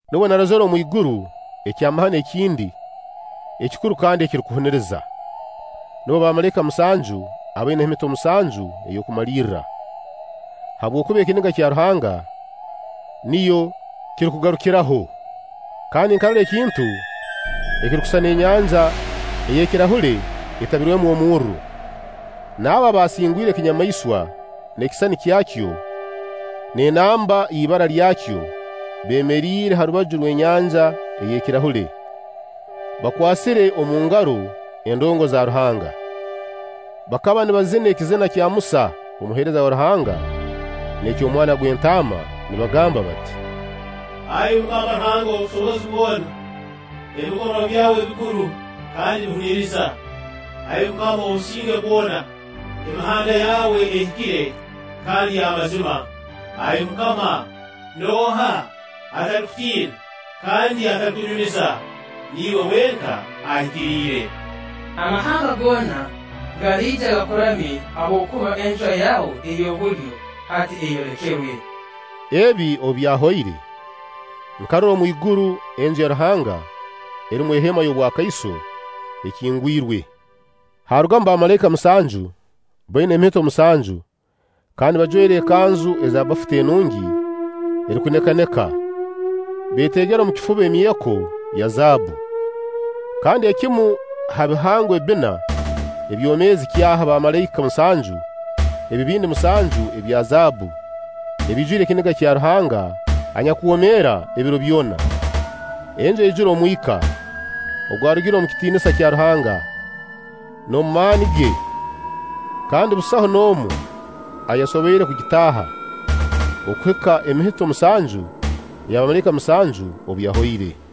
Nubwo narozire omwiguru ekyamahano ekindi ekikuru kandi ekirukuhuniriza. Nubo bamalaika musanju abaina emihito musanju ey'okumalirra, habwokuba ekiniga kya Ruhanga niyo kirukugarukiraho. Kandi nkarora ekintu ekirukusisana enyanja ey'ekirahule etabwirwemu omurro, n'abo abaasingwire ekinyamaiswa n'ekisisani kyakyo n'enamba y'ibara lyakyo beemeriire ha rubaju rw'enyanja ey'ekirahule, bakwasire omu ngaro endongo za Ruhanga. Bakaba nibazina ekizina kya Musa omuheereza wa Ruhanga n'eky'Omwana gw'Entaama nibagamba bati: “Ai MUKAMA Ruhanga ow'obusobozi bwona, ebikorwa byawe bikuru kandi bihuniriza! Ai MUKAMA ow'obusinge bwona, emihanda yawe ehikire kandi y'amazima! Ai MUKAMA nooha atalikutiina kandi atalikunyumiza? Niiwe wenka Ahikiriire. Amahanga goona galiija gakuramye, habwokuba encwa yaawe ey'obulyo, hati eyolekerwe.” Ebi obu byahoire, nkarora omwiguru Enju ya Ruhanga erumu eheema y'obwakaiso ekingwirwe, haarugamu bamalaika musanju baina emihito musanju kandi bajwaire ekanzu eza bafuta enungi erukunekaneka, beetegere omu kifuba emyeko ya zaabbu. Kandi ekimu ha bihangwa ebbina ebyomeezi kyaha bamalaika musanju ebibindi musanju ebya zaabbu ebiijwire ekiniga kya Ruhanga anyakwomeera ebiro byona. Enju yaijura omwika ogwarugire omu kitiinisa kya Ruhanga n'omu maani ge, kandi busaho n'omu ayasoboire kugitaaha okuhika emihito musanju eya bamalaika musanju obu yahoire.